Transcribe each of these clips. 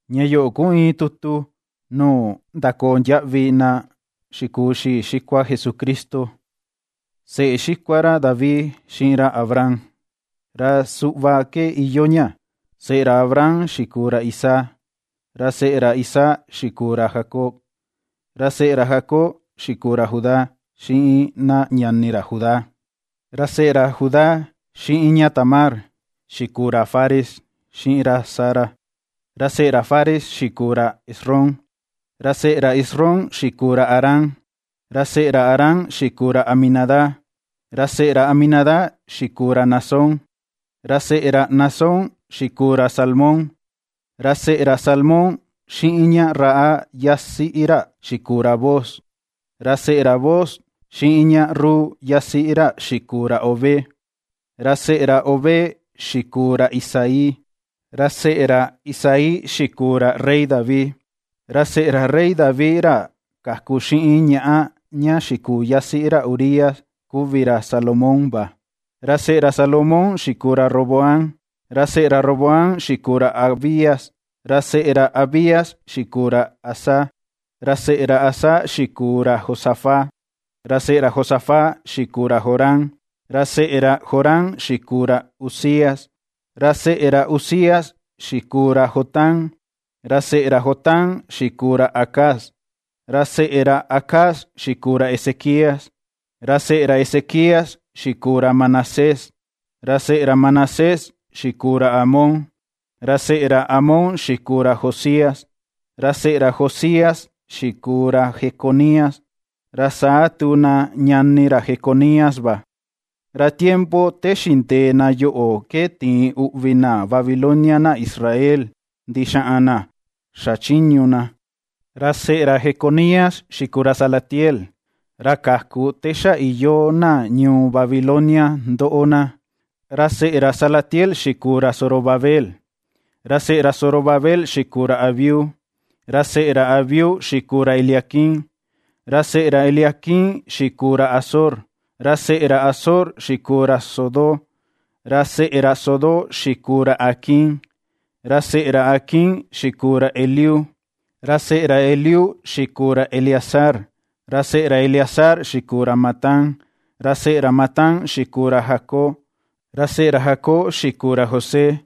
Ña yoꞌo ku iin tutu nuu ndakondiaꞌvi na xikuu xii xikua Jesucristo, seꞌe xikua ra David, xiꞌin ra Abraham. Ra suꞌva ke iyoo ña: seꞌe ra Abraham xikuu ra Isaac, ra seꞌe ra Isaac xikuu ra Jacob, ra seꞌe ra Jacob xikuu ra Judá xiꞌin na ñani ra Judá. Ra seꞌe ra Judá xiꞌin ña Tamar, xikuu ra Fares xiꞌin ra Zara, ra seꞌe ra Fares xikuu ra Esrom, ra seꞌe ra Esrom xikuu ra Aram. Ra seꞌe ra Aram xikuu ra Aminadab, ra seꞌe ra Aminadab xikuu ra Naasón, ra seꞌe ra Naasón xikuu ra Salmón. Ra seꞌe ra Salmón xiꞌin ña Rahab yasiꞌi ra xikuu ra Booz, ra seꞌe ra Booz xiꞌin ña Rut yasiꞌi ra xikuu ra Obed, ra seꞌe ra Obed xikuu ra Isaí. Ra seꞌe ra Isaí xikuu ra rey David, ra seꞌe ra rey David ra kaku xiꞌin ñaꞌa ña xikuu yasiꞌi ra Urías, kuvi ra Salomón va. Ra seꞌe ra Salomón xikuu ra Roboam, ra seꞌe ra Roboam xikuu ra Abías, ra seꞌe ra Abías xikuu ra Asa. Ra seꞌe ra Asa xikuu ra Josafat, ra seꞌe ra Josafat xikuu ra Joram, ra seꞌe ra Joram xikuu ra Uzías. Ra seꞌe ra Uzías xikuu ra Jotam, ra seꞌe ra Jotam xikuu ra Acaz, ra seꞌe ra Acaz xikuu ra Ezequías. Ra seꞌe ra Ezequías xikuu ra Manasés, ra seꞌe ra Manasés xikuu ra Amón, ra seꞌe ra Amón xikuu ra Josías. Ra seꞌe ra Josías xikuu ra Jeconías, ra saa tu na ñani ra Jeconías va. Ra tiempo te xindee na yoꞌo ke tiin uꞌvi na Babilonia na Israel ndixaꞌan na xachiñu na. Ra seꞌe ra Jeconías xikuu ra Salatiel, ra kaku te xa iyoo na ñuu Babilonia ndoꞌo na, ra seꞌe ra Salatiel xikuu ra Zorobabel. Ra seꞌe ra Zorobabel xikuu ra Abiud, ra seꞌe ra Abiud xikuu ra Eliaquim, ra seꞌe ra Eliaquim xikuu ra Azor. Ra seꞌe ra Azor xikuu ra Sodoc, ra seꞌe ra Sodoc xikuu ra Aquim, ra seꞌe ra Aquim xikuu ra Eliud. Ra seꞌe ra Eliud xikuu ra Eleazar, ra seꞌe ra Eleazar xikuu ra Matán, ra seꞌe ra Matán xikuu ra Jacob; Ra seꞌe ra Jacob xikuu ra José,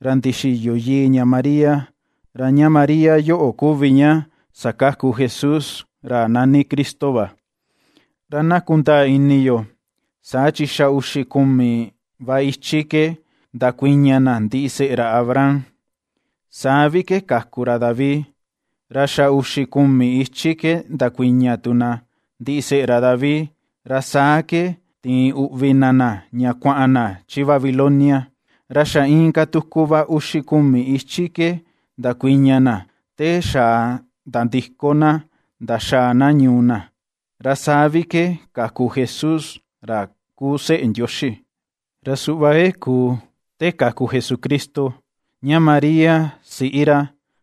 ra ndixiyo ìi̱ ña María, ra ña María yoꞌo kuvi ña sakaku Jesús, ra nani Cristo va. Ra na kundaa ini yo, saa chi xa uxi kumi va ichi ke ndakuiña na ndiseꞌe ra Abraham, saa vi ke kaku ra David, ra xa uxi kumi ichi ke ndakuiña tu na ndiseꞌe ra David, ra saa ke tiin uꞌvi na na, ña kuaꞌan na chi Babilonia, ra xa inka tuku va uxi kumi ichi ke ndakuiña na, te xa nandiko na ndaxaa na ñuu na, ra saa vi ke kaku Jesús ra kuu seꞌe Ndioxi. Ra suꞌva ke kuu te kaku Jesucristo: Ña María siꞌi ra,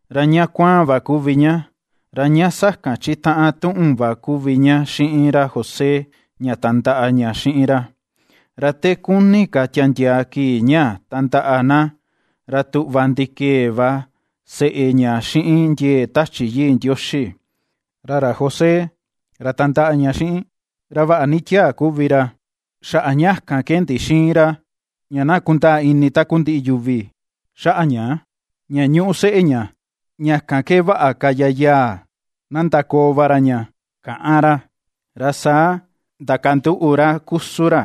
ra ña kuaan va kuvi ña, ra ña sakan chitaꞌan tuꞌun va kuvi ña xiꞌin ra José ña tandaꞌa ña xiꞌin ra. Ra te kuni ka tiandiaa kii ña tandaꞌa na, ra tuꞌva ndikee va seꞌe ña xiꞌin ndiee Tachi Yii Ndioxi. Ra ra José ra tandaꞌa ña xiꞌin, ra vaꞌa ni tiaa kuvi ra, xaꞌa ña kan ke ndixïin ra ña na kundaa ini takundiꞌi yuvi xaꞌa ña ña ñuꞌu seꞌe ña, ña kan ke vaꞌa ka yayaa na ndakoo va ra ña, kaꞌan ra. Ra saa ndakanduꞌu ra kusun ra,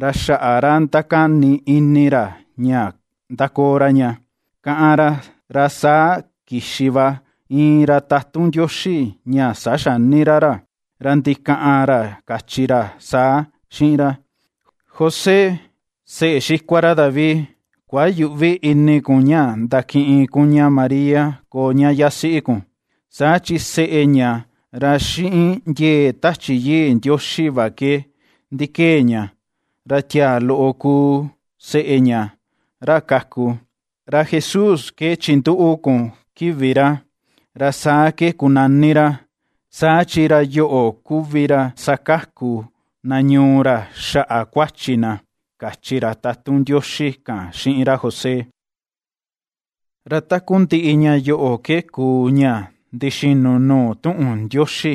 ra xaꞌa ra ndakani ini ra ña ndakoo ra ña ^káꞌán ra, ra saa kixi va iin ra tatun Ndioxi ña saxani ra ra, ra ndikaꞌan ra kachi ra saa xiꞌin ra: ―José, seꞌe xikua ra David, kuayüꞌvi ini kun ña ndakiꞌin kun ña María koo ña yasiꞌi kun, saa chi seꞌe ña, ra xiꞌin ndiee Tachi Yii Ndioxi va ke ndikee ña. Ra tiaa loꞌo kuu seꞌe ña ra kaku, ra JESÚS ke chinduꞌu kun kivi ra, ra saa ke kunani ra, saa chi ra yoꞌo kuvi ra sakaku na ñuu ra xaꞌa kuachi na ―kachi ra tatun Ndioxi kan xiꞌin ra José. Ra takundiꞌi ña yoꞌo ke kuu, ña ndixinu nuu tuꞌun Ndioxi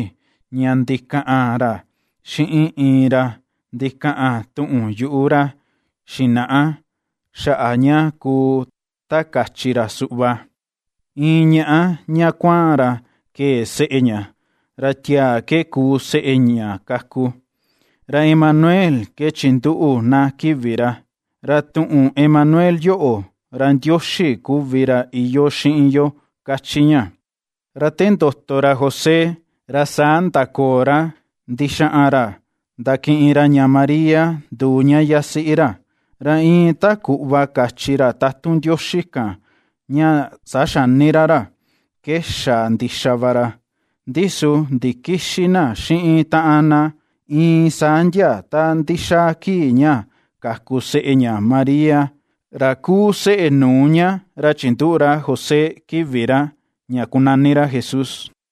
ña ndikaꞌan ra xiꞌin iin ra ndikaꞌan tuꞌun yuꞌu ra xinaꞌa xaꞌa ña kuu ta kachi ra suꞌva: Iin ñaꞌa ña kuaan ra kee seꞌe ña, ra tiaa ke kuu seꞌe ña kaku, ra Emanuel ke chinduꞌu na kivi ra. Ra tuꞌun Emanuel yoꞌo, ra Ndioxi kuvi ra iyoo xiꞌin yo ^kachi ña. Ra te ndoto ra José ra saa ndakoo ra ndixaꞌan ra ndakiꞌin ra ña María nduu ña yasiꞌi ra, ra iin ta kuꞌva kachi ra tatun Ndioxi kan ña saxani ra ra, ke xa ndixa va ra. Ndi su ndikïxi na xiꞌin taꞌan na iin saa ndia ta ndixaa kii ña kaku seꞌe ña Maria, ra kuu seꞌe nuu ña ra chinduꞌu ra José kivi ra ña kunani ra JESÚS.